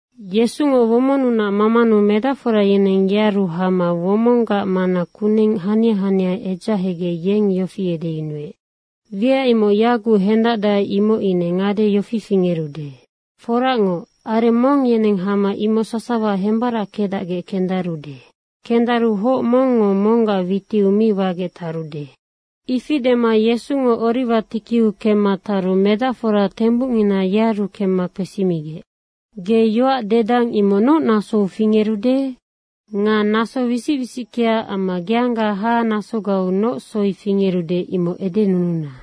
Yesungo womonnunac mamanu medacfora yeneng yearu hama womonggac mana kuneng hania hania edzahegec yeng yofi edeyunuec, “Wiac imoc yaguc hendacdae, imoc ine ngade yofi fingerude. Foracngoc, areng mong yeneng hama imoc sasawa hembarackedacgec kendarude. Kendaru hoc mongngo monggac witiu mi wagec tarude.” Ifi dema Yesungo Oriwa tikiu kemma taru medacfora tembucngina yearu kemma kpesimigec, “Ge yoac dedang imoc noc nasou fingerude? Nga naso wisic wisickea amma geangga hahanasogau noc soi fingerude, imoc edenununa.”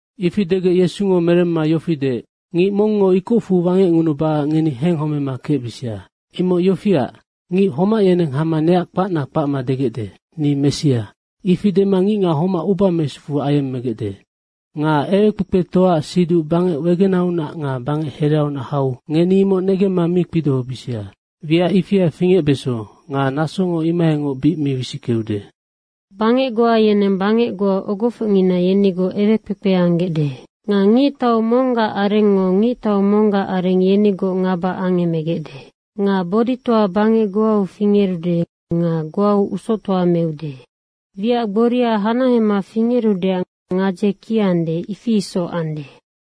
Ifi degec Yesungo meremma yofi deec, “Ngic mongngo ikocfu wangecngunubacac ngeni henghomema kecbisia. Imoc yofiac, ngic homac yeneng hama neac kpac kpacma degecde, ‘Ni Messia.’ ifi dema ngicngac homac uba mesufu ayemmegecde. Nga ewekpekpetoaac siduc bangec wegenaunac nga bangec hereaunac hau ngeni imoc negemma mi kpidohobisia. Wiac ifia fingecbeso nga nasongo imohaingoc bic mi wisickeude. Bangec goa yeneng bangec ogofocngina yenigoc ewekpekpe anggecde. Nga ngictau monggac arengngo ngictau monggac areng yenigoc ngaba angemegecde. Nga boditoa bangec goau fingerude nga goau usoctoa meude. Wiac gboria hanahema fingerudeac gadze kiande, ifi isoc ande.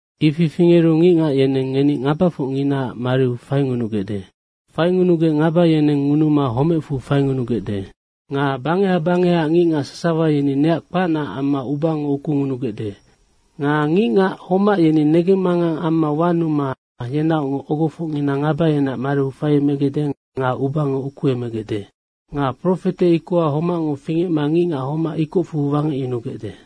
Ifi fingeru ngicngac yeneng ngeni ngabafocnginaac mariu faingunugecde. Faingunugec ngaba yeneng ngunuma homecfu faingunugecde. Nga bangeha bangehaac ngicngac sasawa yeni neac kpacnaac amma ubango ukungunugecde. Nga ngicngac homac yeni negemmangang amma wanuma yenaocngoc ogofocngina ngaba yeneac mariu faiemegecde nga ubango ukuemegecde. Nga profete ikoha homacngo fingecma ngicngac homac ikocfu wangecyunugecde.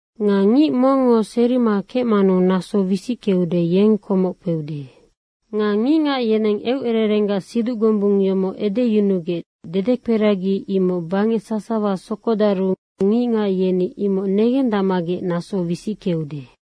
Nga ngic mongngo serima kecmanu naso wisickeude, yeng komoc kpeude. Nga ngicngac yeneng eucererenggac siduc gombung yomoc edeyunugec dedekperagi imoc bangec sasawa sokodaru ngicngac yeni imoc negendacmagec naso wisickeude.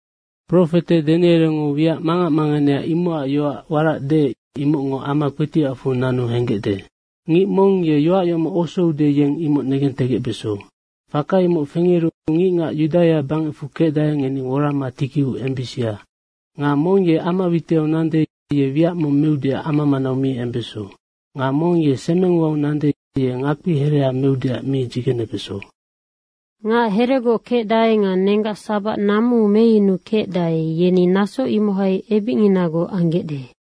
Profete Danierengo wiac mangac manganea imocac yoac warac deec, imocngo ama kpetiacfu nanu henggecde. Ngic mong ye yoac yomoc osoude, yeng imoc negentegecbeso. Faka imoc fingeru ngicngac Yudaia bangecfu kecdae, ngeni worama tikiu embisia. Nga mong ye ama witiau nande, ye wiac mong meudeac ama manau mi embeso. Nga mong ye semeng uau nande, ye ngakpi hereha meudeac mi dzigenebeso. Ngac heregoc kecdae nga nenggac sabac namuu meyunukecdae, yeni naso imohai ebicnginagoc anggecde.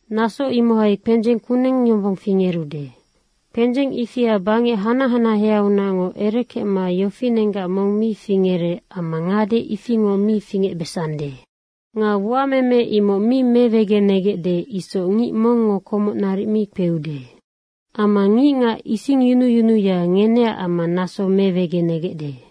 Naso imohai kpendzeng kuneng yombong fingerude. Kpendzeng ifia bangec hanac hanaheaunacngoc erekecma yofinenggac mong mi fingerec amma ngade ifingoc mi fingecbesande. Nga uameme imoc mi mewegenegecde isoc ngic mongngo komoc naric mi kpeude. Amma ngicngac isingyunuyunuya, ngeneac amma naso mewegenegecde.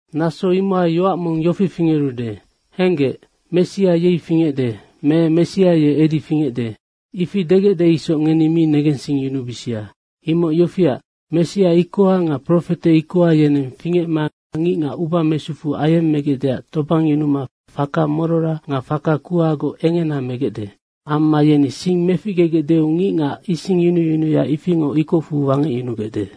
Naso imohai yoac mong yofi fingerude, ‘Henggec, Messia yei fingecde.’ me ‘Messia ye edi fingecde.’ Ifi degecde isoc ngeni mi negensingyunubisia. Imoc yofiac, Messia ikoha nga profete ikoha yeneng fingecma ngicngac uba mesufu ayemmegecdeac tobangyunuma faka morora nga faka kuhagoc engena megecde. Amma yeni sing meficgegecdeu ngicngac isingyunuyunuya ifingoc ikocfu wangecyunugecde.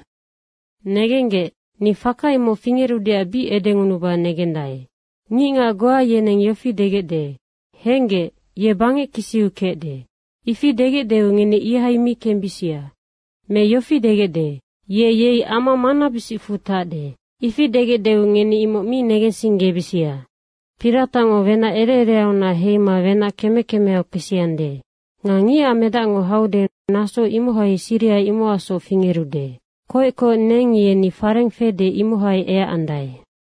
Negenggec, ni faka imoc fingerudeac bic edengunuba negendae. Ngicngac goa yeneng yofi degecde, ‘Henggec, ye bangec kisiu kecde.’ Ifi degecdeu ngeni ihai mi kembisia. Me yofi degecde, ‘Ye yei ama manabisicfu tacde.’ Ifi degecdeu ngeni imoc mi negensinggebisia. Piratacngo wenac ere ereaunac heima wenac keme kemeau kpesiande. Nga Ngicac Medac haude, naso imohai siriha imocacsoc fingerude. Koec koec neng yeni fareng fede, imohai eacandae.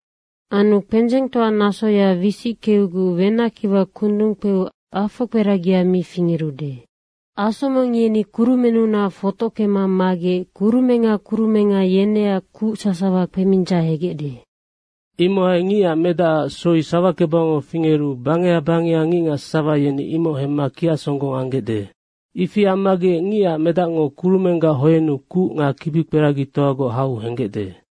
Anu kpendzengtoa nasoya wisickeuguc wenackiwa kundung kpeu afokperagia mi fingerude. Asomeng yeni kurumennunac fotockema magec kurumenga kurumenga yeneac kuc sasawa kpemindzahegecde. Imohai Ngicac Medacac soi sawakebangau fingeru bangeha bangeha ngicngac sasawa yeni imoc hemma kiacsonggong anggecde. Ifi ammagec Ngicac Medacngo kurumenggac hoennu kuc nga kibikperagitoagoc hau henggecde.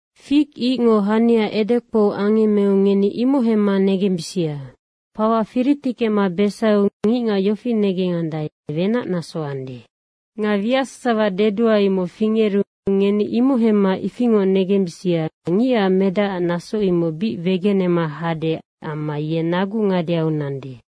Fig icngo hania edekpou angemmeu ngeni imoc negembisia. Fawa firitickema besaiu ngicngac yofi negengandae, wenac naso ande. Nga wiac sasawa dedua, imoc fingeru ngeni imoc hemma ifingoc negembisia, Ngicac Medacac naso imoc bic wegenema hade amma ye nagu ngadeau nande.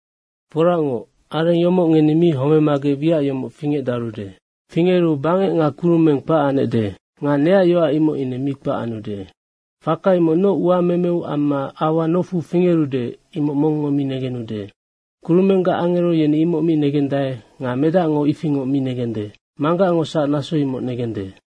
Foracngoc, areng yomoc ngeni mi homemagec wiac yomoc fingecdarude. Fingeru bangec nga kurumeng kpac anecde nga neac yoac, imoc ine mi kpac anude. Faka imoc noc uamemeu amma aua nofu fingerude, imoc mongngo mi negenude. Kurumenggac angero yeni imoc mi negendae nga Medacngo ifingoc mi negende. Manggacngosac naso imoc negende.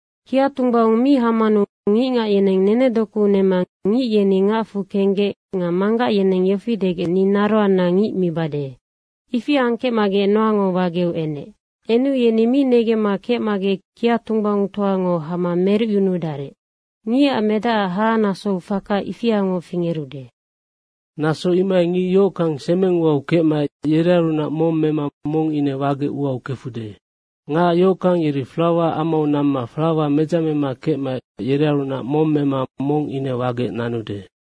Kiatunggbaung mi hamanu ngicngac yeneng nenedoku nema ngic yeni ngacfu kenggec nga manggac yeneng yofi degec, ‘Ni naroanna ngic mibade.’ ifi angkecmagec Noango wageu enec. Enu yeni mi negemma kecmagec kiatunggbaungtoango hama merucyunudarec. Ngicac Medacac hahanasou faka ifiangoc fingerude. Naso imohai ngic yohockang semeng uau kecmaec yerearunac mong mema mong ine wagec uau kefude. Ngac yohockang yeri flawa amau namma flawa medzamema kecmaec yerearunac mong mema mong ine wagec nanude.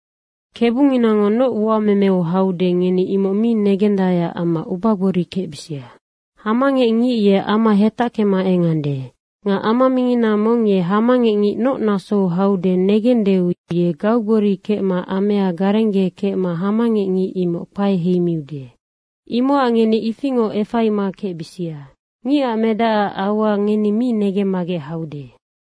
Kebunginango noc uamemeac haude, ngeni imoc mi negendaeac amma ubagbori kecbisia. Hamangecngic ye ama hetackema engande. Nga ama mingina mong ye hamangecngic noc nasou haude negendeu ye gaugbori kecma amea garenggekecma hamangecngic imoc kpae heimiude. Imocac ngeni ifingoc efaima kecbisia. Ngicac Medacac aua ngeni mi negemmagec haude.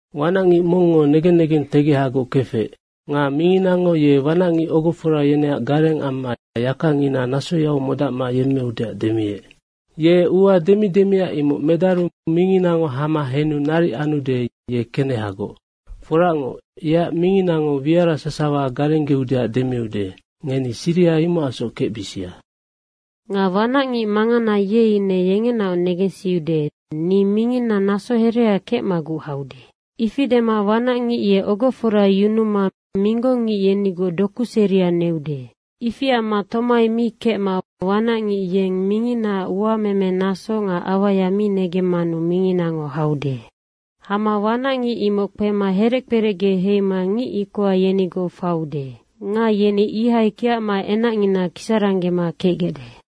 Wanacngic mongngo negen negentegehagoc kefec. Nga minginango ye wanacngic ogofora yeneac gareng amma yakangina nasoyau modacma yemmeudeac demiec. Ye ua demi demia imoc medaru minginango hama henu naric anude, ye kenehagoc. Foracngoc, yeac minginango wiara sasawa garenggeudeac demiude. Ngeni siriha imocacsoc kecbisia. Nga wanacngic mangana, ye ine yengenaoc negensiude, ‘Ni minginna naso herea kecmaguc haude.’ Ifi dema wanacngic ye ogofora yunuma minggong ngic, yenigoc doku seria neude. Ifi amma tomai mi kecma wanacngic yeng minginaac uamemenaso nga auaya mi negemmanu minginango haude. Hama wanacngic imoc kpema herec kperecge heima ngic ikoha yenigoc faiude. Nga yeni ihai kiacma enacngina kisaranggema kecgecde.”